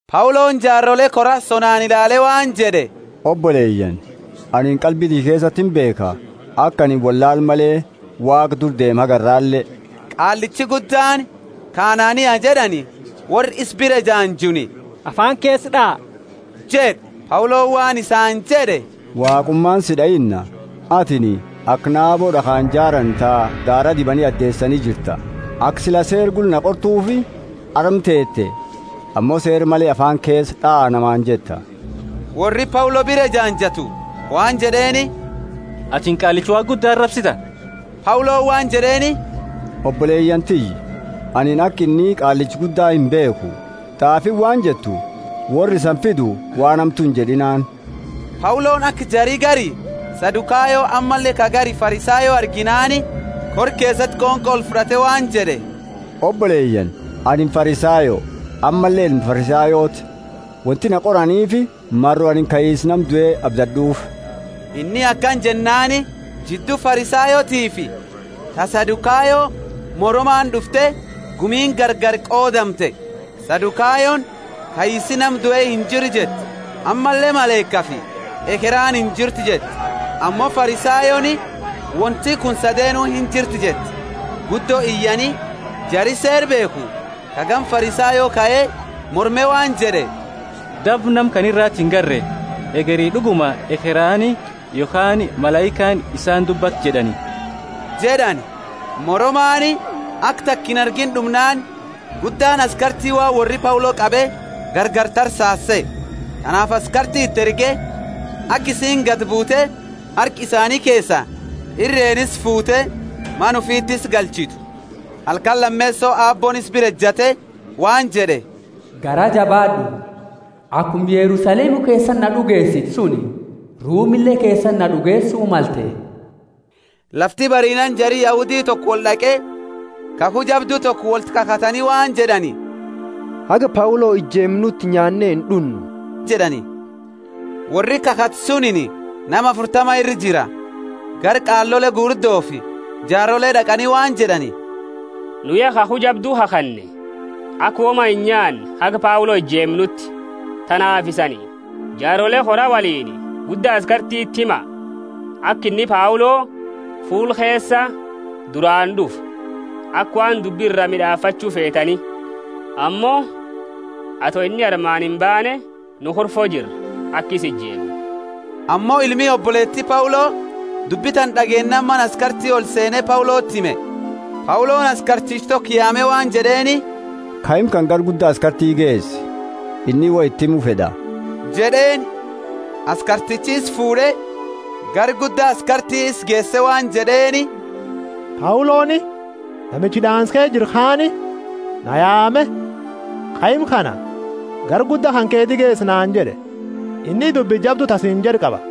Pauloni jaarole kora sonaani ilaale waan jed'e, Oboleyaani, anini qalbi tiyya keesati imbeekha, aka anini, wollaala male, Waaqa dura deeme haga arrale. Qaallichi Guddaani, ka Anania jed'ani, worra isa bira ejaanjuuni, Afaani keesa d'aa jed'e. Pauloni waan isaani jed'e, Waaqumaani si d'ainna, atini aka naabo d'akhaani jaraani ta daara dibani adeesani jirta; aka sila Seera gula na qortuufi arma teete ammo Seera male afaani keesa d'aa namaani jetta? Worri Paulo bira ejaanjatu waan jed'eeni, Atini Qaallicha Waaqa Gudda arabsita! Pauloni waan jed'eeni, Oboleyaani tiyya, anini aka inni Qaallicha Gudda imbeekhu. T'aafiini waan jettu, Worra isani fidu waan hamtu injed'inaani. Pauloni aka jari gari Sadukayo ammalle ka gari Farisayo arginaani, kora keesati qonqo olfud'ate waan jed'e, Oboleyaani, anini Farisayo, ammalle ilma Farisayooti. Wonti na qoraniifi maro anini kaisa nama due abdad'uufi. Inni akana jennaani, jiddu Farisayootiifi ta Sadukayo moramaani d'ufte gumiini gargari qoodamte. Sadukayoni, Kaisi nama due injiru jetti; ammalle malaikafi ekheraani injirtu jetti, ammo Farisayooni, wonti kuni sadeenu injirti jetti. Guddo iyani, jari Seera beekhu ka gama Farisayo kae morme waan jed'e, Daba nama kana irati ingarre, hegeri d'uguma ekheraani yokhaani malaikaani isaani dubbatte jed'ani. Moromaani aka taka inargiini d'umnaani guddaani askarti waan worri Paulo qabe gargari tarsaasu sehe. Tanaafi askarti iti erge, aka isiini gadi buute harka isaani keesa irreeni isa fuute mana ufiti isa galchitu. Halkani lameeso Aabbooni isa bira ejate waan jed'e, Garaa jabaad'u, akuma Yerusalemu keesati na d'ugeesite suni, Rumile keesati na d'ugeesu malte. Lafti bariinaani jari Yahudi toko wold'aqe, kakhu jabdu toko wolti kakhatani waan jed'ani, Haga Paulo ijeemnuti nyaane ind'unnu jed'ani. Worri kakhate sunini nama afurtama ira jira. Gara qaalole gugurdofi jaarole d'aqani waan jed'ani, Nu ya kakhu jabdu kakhanne, aka woma inyaanne haga Paulo ijeemnuti. Tanaafi isani, jaarole kora woliini, gudda askartiti hima, aka inni Paulo fuula keesa duraani d'ufu, aka waan dubbi ira mid'aafachu feetani. Ammo ato inni armaani imbaane, nu kurfo jirra, aka isa ijeemnu. Ammo ilmi oboleeti Paulo dubbi tana d'ageennaani mana askarti olseene Pauloti hime. Pauloni askarticha toko yaame waan jed'eeni, Kaima kana gara gudda askarti geesi. Inni woi iti himu fed'a jed'eeni. Askartichi isa fuud'e, gara gudda askarti isa geese waan jed'eeni, Pauloni, namichi hid'aansa keesa jiru kaani, na yaame, Kaima kana gara gudda kanketi geesi naani jed'e; inni dubbi jabdu ta siini jed'u qaba.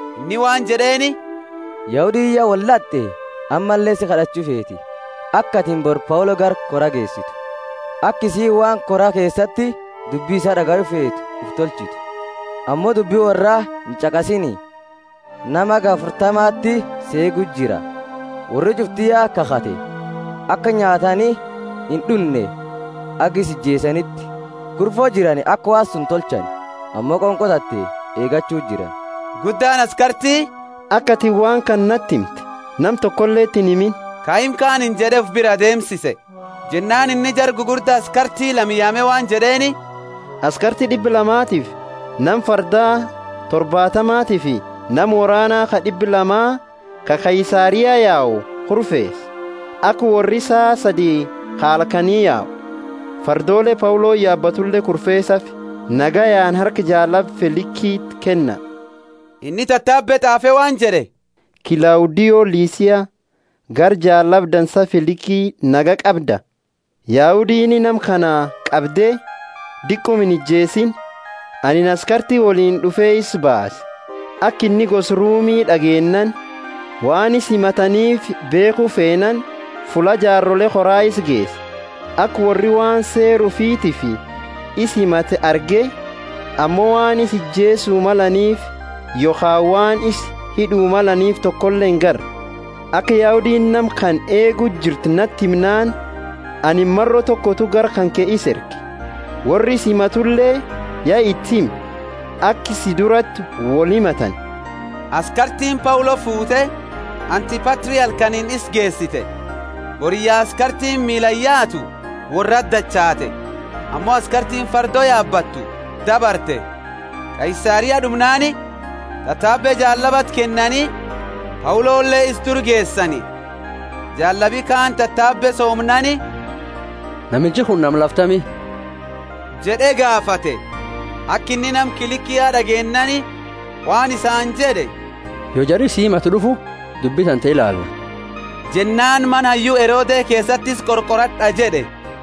Inni waan jed'eeni, Yahudiini ya wold'ate ammalle si kad'achu feeti, aka atini bori Paulo gara kora geesitu, aka isiini waan kora keesati dubbi isaa d'agayu feetu ufi tolchitu. Ammo dubbi worra inch'aqasiini, nama haga afurtamati isa eegu jira. Worri ch'ufti ya kakhate, aka nyaatani ind'unne haga isa ijeesaniti. Kurfo jirani aka waan suni tolchani, ammo qonqo tante eegachu jirani. Guddaani askarti, Aka atini waan kana nati himte nama tokoleti inhimini, kaima kaaniini jed'e, ufi biraa deemsise. Jennaani inni jara gugurda askarti lama yaame waan jed'eeni, askarti d'ibba lamatifi nama fardaa torbaatamafi nama worraani ka d'ibba lama ka Kaisaria yau kurfeesa aka worri saa sadi ka halkani yau. Fardoole Pauloni yaabatule kurfeesaafi, nagayaani harka jaallaba Felikiti kenna. Inni tatabe t'aafe waan jed'e, Klaudio Lisia, gara jaallaba dansa Feliki: Nagaya qabda? Yahudiini nama kana qabde diquma inijeesiini. Anini askarti woliini d'ufe isa baase, aka inni gosa Rumi d'ageennaani. Waan isa himataniifi beekhu feenaani, fulla jaarole koraa isa geese. Aka worri waan seera ufitiifi isa himatani arge, ammo waan isa ijeesu malaniifi yokhaani waan isa hid'u malaniifi tokole ingarre. Aka Yahudiini nama kana eegu jirtu nati himnaani anini maro tokotu gara kanke isa erge. Worra isa himatule ya iti hime, aka si durati wolhimatani. Askartiini Paulo fuute Antipatri halkaniini isa geesite. Boriyya askartiini miilaani yaatu worrati dachaate, ammo askartiini fardo yaabattu dabarte. Kaisaria d'umnaani tatabe jaallabati kennani Paulole isa dura geesani. Jaallabi kaani tatabe soomnaani, Namichi kunini nama lafa tami? jed'e gaafate. Aka inni nama Kilikia d'ageennaani waan isaani jed'e, Yo jari si himatu d'ufu, dubbi tante ilaala. Jennaani mana hayyu Herode keesati isa qorqorad'a jed'e.